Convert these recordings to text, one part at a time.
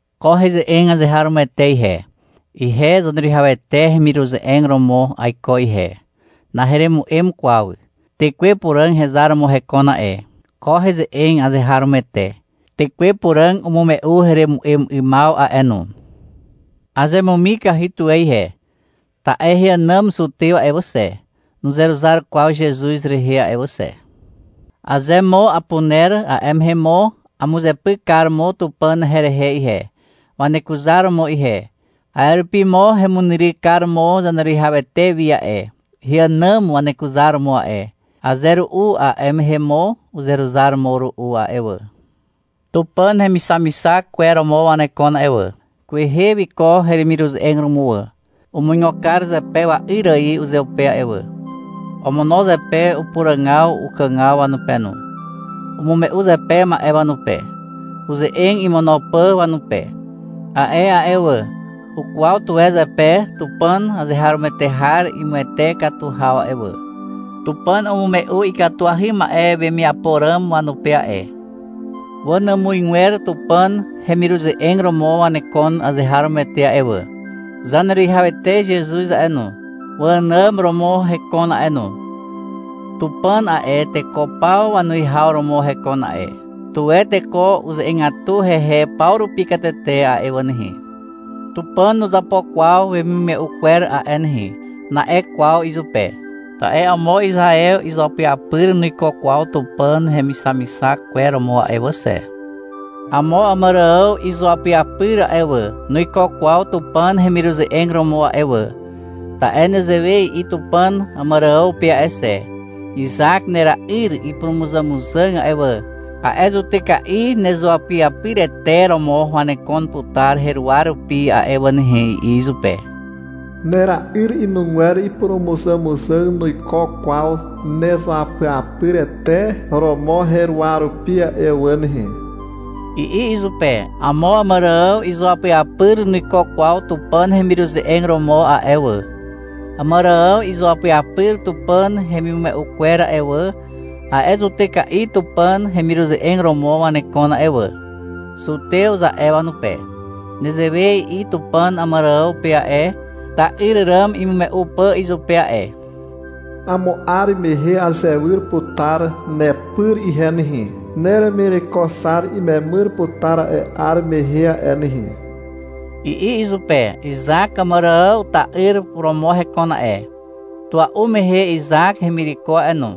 Ko heze'eg azeharomoete ihe. Ihe Zaneruwihawete hemiruze'eg romo aiko ihe. Naheremu'em kwaw. Tekwe Puràg hezar romo hekon a'e. Ko heze'eg azeharomoete. Tekwe Puràg umume'u heremu'em 'ymaw a'e no. Azemumikahy tuwe ihe, ta'e heànàm zutew a'e wà xe, nuzeruzar kwaw Zezuz rehe a'e wà xe. Aze mo apuner, a'e mehe mo amuzepyk kar mo Tupàn herehe ihe, wanekuzar romo ihe. A'e rupi mo hemunyryk kar mo Zaneruwihawete wi a'e, heànàm wanekuzaromo a'e. Aze ru'u a'e mehe mo uzeruzar mo ru'u a'e wà. Tupàn hemixamixak kwer romo wanekon a'e wà. Kwehe wiko hemiruze'eg romo wà. Umuigo kar zepe wa'yr ài uzeupe a'e wà. Omono zepe upuràgaw ukàgaw wanupe no. Umume'u zepe ma'e wanupe, uze'eg imono pà wanupe. A'e a'e wà, ukwaw tuwe zepe Tupàn azeharomoete har imuwete katu haw a'e wà. Tupàn umume'u ikatuahy ma'e wemiapo ràm wanupe a'e. Wanàmuzgwer Tupàn hemiruze'eg romo wanekon azeharomoete a'e wà. Zaneruwihawete Zezuz a'e no, waànàm romo hekon a'e no. Tupàn a'e, teko paw wanuwihaw romo hekon a'e. Tuwe teko uze'egatu hehe paw rupi katete a'e wà nehe. — Tupàn nuzapo kwaw wemimume'u kwer a'e nehe, na'e kwaw izupe. Ta'e amo Izaew izuapyapyr nuiko kwaw Tupàn hemixamixak kwer romo a'e wà xe. Amo Àmàrààw izuapyapyr a'e wà, nuiko kwaw Tupàn hemiruze'eg romo a'e wà. Ta'e nezewe i'i Tupàn Àmàrààw pe a'e xe. — Izak nera'yr ipurumuzàmuzàg a'e wà, a'e zutyka'i nezuapyapyrete romo wanekon putar heruwa rupi a'e wà nehe, i'i izupe. — Nera'yr inugwer ipurumuzàmuzàg nuiko kwaw nezuapyapyrete romo heruwa rupi a'e wà nehe, i'i izupe. Amo Àmàrààw izuapyapyr nuiko kwaw Tupàn hemiruze'eg romo a'e wà. Àmàrààw izuapyapyr Tupàn hemimume'u kwer a'e wà, a'e zutyka'i Tupàn hemiruze'eg romo wanekon a'e wà. (-Zutew, za'e wanupe.) Nezewe i'i Tupàn Àmàrààw pe a'e, ta'yr ràm imume'u pà izupe a'e. — Amo 'ar mehe azewyr putar nepyr ihe nehe. Neremireko Xar imemyr putar a'e 'ar mehe a'e nehe, i'i izupe. Izak Àmàrààw ta'yr romo hekon a'e. Tua'u mehe Izak hemireko a'e no.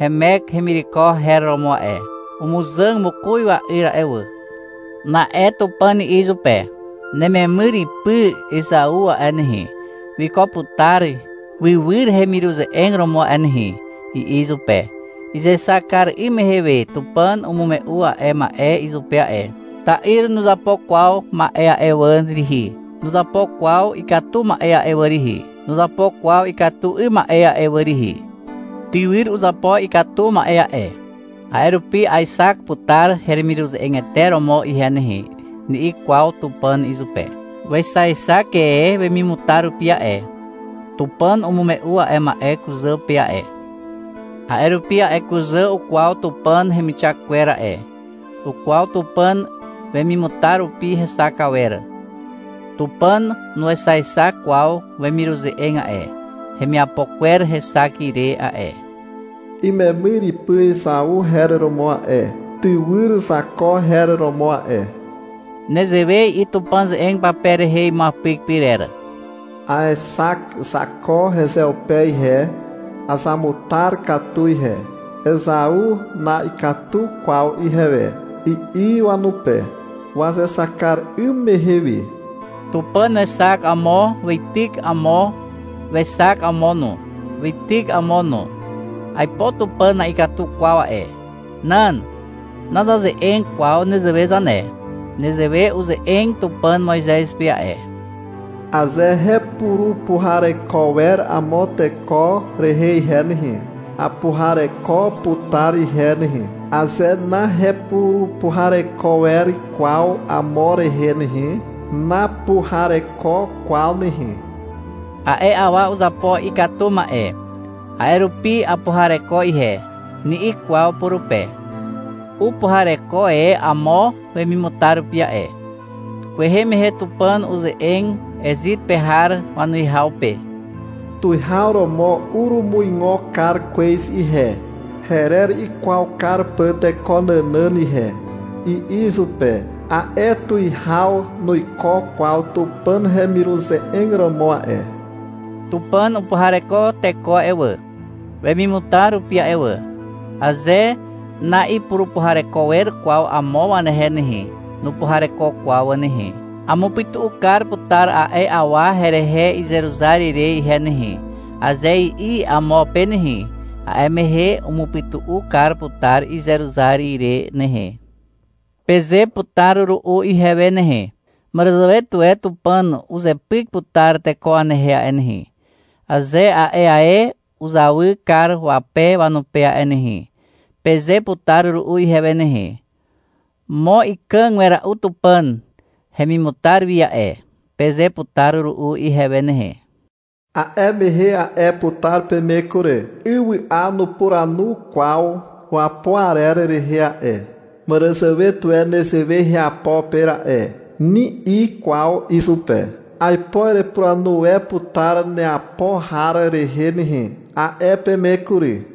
Hemek hemireko her romo a'e. Umuzàg mokoz wa'yr a'e wà. Na'e Tupàn i'i izupe. — Nememyr ipy Ezau a'e nehe, wiko putar wywyr hemiruze'eg romo a'e nehe, i'i izupe. Izexak kar 'ym mehe we Tupàn umume'u a'e ma'e izupe a'e. Ta'yr nuzapo kwaw ma'e a'e wà rihi. Nuzapo kwaw ikatu ma'e a'e wà rihi. Nuzapo kwaw ikatu 'ym ma'e a'e wà rihi. — Tywyr uzapo ikatu ma'e a'e, a'e rupi aexak putar heremiruze'egete romo ihe nehe, ni'i kwaw Tupàn izupe. Wexaexak e wemimutar rupi a'e. Tupàn umume'u a'e ma'e kuzà pe a'e. A'e rupi a'e kuzà ukwaw Tupàn hemixak kwer a'e. Ukwaw Tupàn wemimutar rupi hexak awer. Tupàn nuexaexak kwaw wemiruze'eg a'e, hemiapo kwer hexak ire a'e. (Imemyr ipy Ezau her romo a'e. Tywyr Zako her romo a'e.) Nezewe i'i Tupàn ze'eg pape rehe imuapyk pyrer. — Aexak Zako hezeupe ihe. Azamutar katu ihe. Ezau na'ikatu kwaw ihewe, i'i wanupe, wazexak kar 'ym mehe we. Tupàn wexak amo, weityk amo, wexak amo no, weityk amo no. Aipo Tupàn na'ikatu kwaw a'e. Nan. Nazaze'eg kwaw nezewe zane. Nezewe uze'eg Tupàn Moizez pe a'e. — Aze hepurupuhareko wer amo teko rehe ihe nehe, apuhareko putar ihe nehe. Aze nahepurupuhareko wer kwaw amo rehe nehe, napuhareko kwaw nehe. — A'e awa uzapo ikatu ma'e, a'e rupi apuhareko ihe, ni'i kwaw purupe. Upuhareko e amo wemimutar rupi a'e. Kwehe mehe Tupàn uze'eg Ezit pe har wanuwihaw pe. — Tuwihaw romo urumuigo kar kwez ihe, herer ikwaw kar pà teko nànàn ihe, i'i izupe. (A'e tuwihaw nuiko kwaw Tupàn hemiruze'eg romo a'e.) Tupàn upuhareko teko a'e wà, wemimutar rupi a'e wà. Aze na'ipurupuhareko wer kwaw amo wanehe nehe, nupuhareko kwaw wà nehe. — Amupytu'u kar putar a'e awa herehe izeruzar ire ihe nehe, aze i'i amo pe nehe, a'e mehe umupytu'u kar putar izeruzar ire nehe. Peze putar ru'u ihewe nehe. — Màràzàwe tuwe Tupàn uzepyk putar teko wanehe a'e nehe, aze a'e ae uzawy kar wape wanupe a'e nehe, peze putar ru'u ihewe nehe. — Mo ikàg wera'u Tupàn hemimutar wi a'e, peze putar ru'u ihewe nehe. A'e mehe a'e putar peme kury. Ywy'a nupuranu kwaw wapo arer rehe a'e. — Màràzàwe tuwe nezewe heapo pe ra'e, ni'i kwaw izupe. — Aipo erepuranu e putar neapo har rehe nehe, a'e peme kury.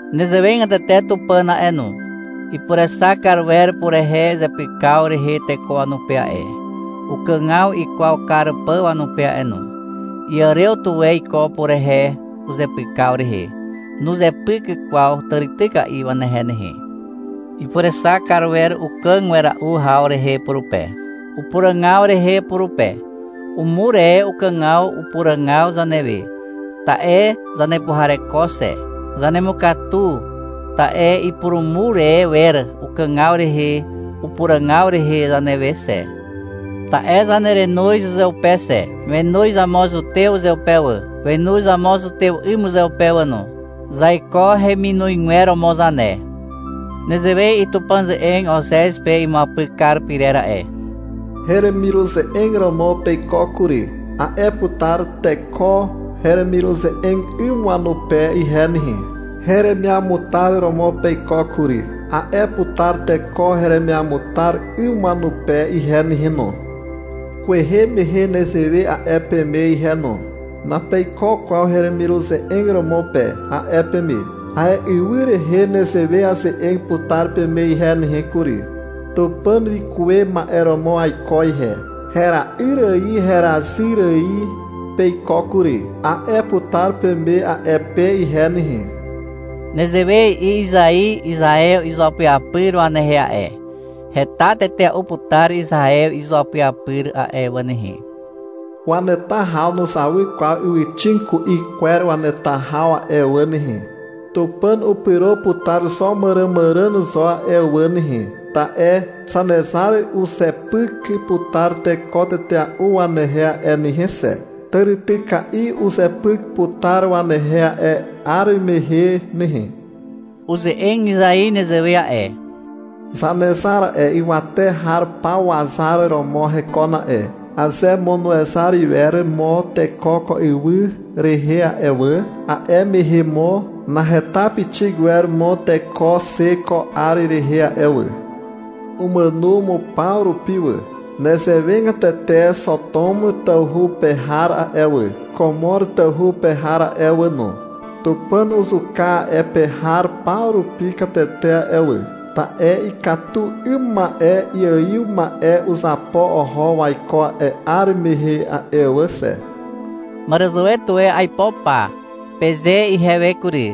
Nezewegatete Tupàn a'e no. Ipurexak kar wer purehe uzepykaw rehe teko wanupe a'e, ukàgaw ikwaw kar pà wanupe a'e no. Iàrew tuwe iko purehe uzepykaw rehe. Nuzepyk kwaw tàrityka'i wanehe nehe. Ipurexak kar wer ukàg wera'u haw rehe purupe, upuràgaw rehe purupe. Umur e ukàgaw upuràgaw zanewe, ta'e zanepuhareko xe. Zanemukatu, ta'e ipurumur e wer ukàgaw rehe upuràgaw rehe zanewe xe. Ta'e zanerenoz uzeupe xe. Wenoz amo zutew uzeupe wà. Wenoz amo zutew 'ym uzeupe wà no. Zaiko heminozgwer romo zane. Nezewe i'i Tupàn ze'eg Ozez pe imuapyk kar pyrer a'e. — Heremiruze'eg romo peiko kury, a'e putar teko heremiruze'eg 'ym wanupe ihe nehe. — Heremiamutar romo peiko kury, a'e putar teko heremiamutar 'ym wanupe ihe nehe no. Kwehe mehe nezewe a'e peme ihe no. — Napeiko kwaw heremiruze'eg romo pe, a'e peme. A'e ywy rehe nezewe aze'eg putar peme ihe nehe kury. — Tupàn wikuwe ma'e romo aiko ihe. Hera'yr ài herazyr ài peiko kury, a'e putar peme a'e pe ihe nehe. Nezewe i'i Izai Izaew izuapyapyr wanehe a'e. — Heta tetea'u putar Izaew izuapyapyr a'e wà nehe. Waneta haw nuzawy kwaw ywyxig ku'i kwer waneta haw a'e wà nehe. Tupàn upyro putar xo màràmàràn zo a'e wà nehe. Ta'e Zanezar uzepyk putar teko tetea'u wanehe a'e nehe xe. Tàrityka'i uzepyk putar wanehe a'e 'ar mehe nehe. Uze'eg Izai nezewe a'e. Zanezar a'e, ywate har paw wazar romo hekon a'e. Aze mo nuezar iwer mo teko ko ywy rehe a'e wà, a'e mehe mo naheta pixik iwer mo teko xe ko 'ar rehe a'e wà. Umàno mo paw rupi wà. Nezewegatete Xotom tawhu pe har a'e wà, Komor tawhu pe har a'e wà no, Tupàn uzuka a'e pe har paw rupi katete a'e wà, (ta'e ikatu 'ym ma'e iaiw ma'e uzapo oho waiko a'e 'ar mehe a'e wà xe). Màràzàwe tuwe aipo pa, peze ihewe kury.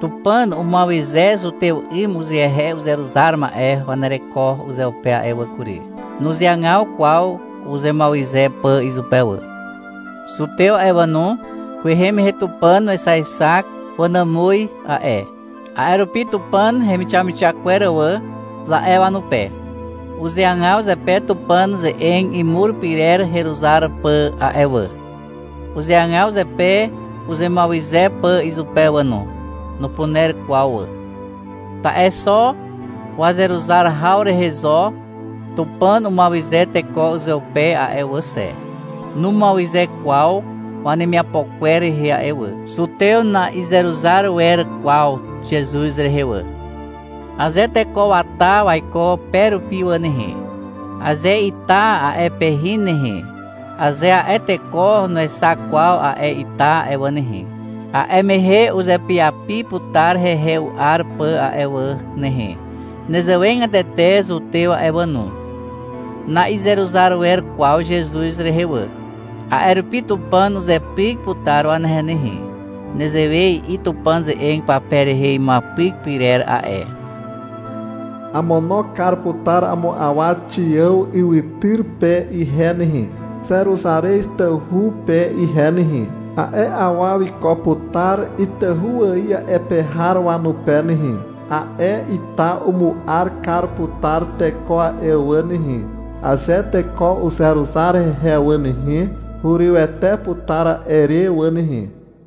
Tupàn umuawyze zutew 'ym uzehe uzeruzar ma'e wanereko uzeupe a'e wà kury. Nuzeagaw kwaw uzemuawyze pà izupe wà. Zutew a'e wà no, kwehe mehe Tupàn wexaexak wanàmuz a'e. A'e rupi — Tupàn hemixamixak kwer wà, za'e wanupe. Uzeagaw zepe Tupàn ze'eg imur pyrer heruzar pà a'e wà. Uzeagaw zepe uzemuawyze pà izupe wà no. Nupuner kwaw wà. Ta'e xo wazeruzar haw rehe zo Tupàn umuawyze teko uzeupe a'e wà xe. Numuawyze kwaw wanemiapo kwer rehe a'e wà. Zutew na'izeruzar wer kwaw Zezuz rehe wà. Aze teko wata waiko pe rupi wà nehe, aze ita a'e pe hin nehe, aze a'e teko nuexak kwaw a'e ita a'e wà nehe, a'e mehe uzepyapi putar hehe u'ar pà a'e wà nehe. Nezewegatete zutew a'e wà no. Na'izeruzar wer kwaw Zezuz rehe wà. A'e rupi Tupàn uzepyk putar wanehe nehe. Nezewe i'i Tupàn ze'eg pape rehe imuapyk pyrer a'e. — Amono kar putar amo awa Xiàw ywytyr pe ihe nehe (Zeruzarez tawhu pe ihe nehe). A'e awa wiko putar itahu ài a'e pe har wanupe nehe. A'e ita umu'ar kar putar teko a'e wà nehe. Aze teko uzeruzar hehe wà nehe, hurywete putar a'e re wà nehe.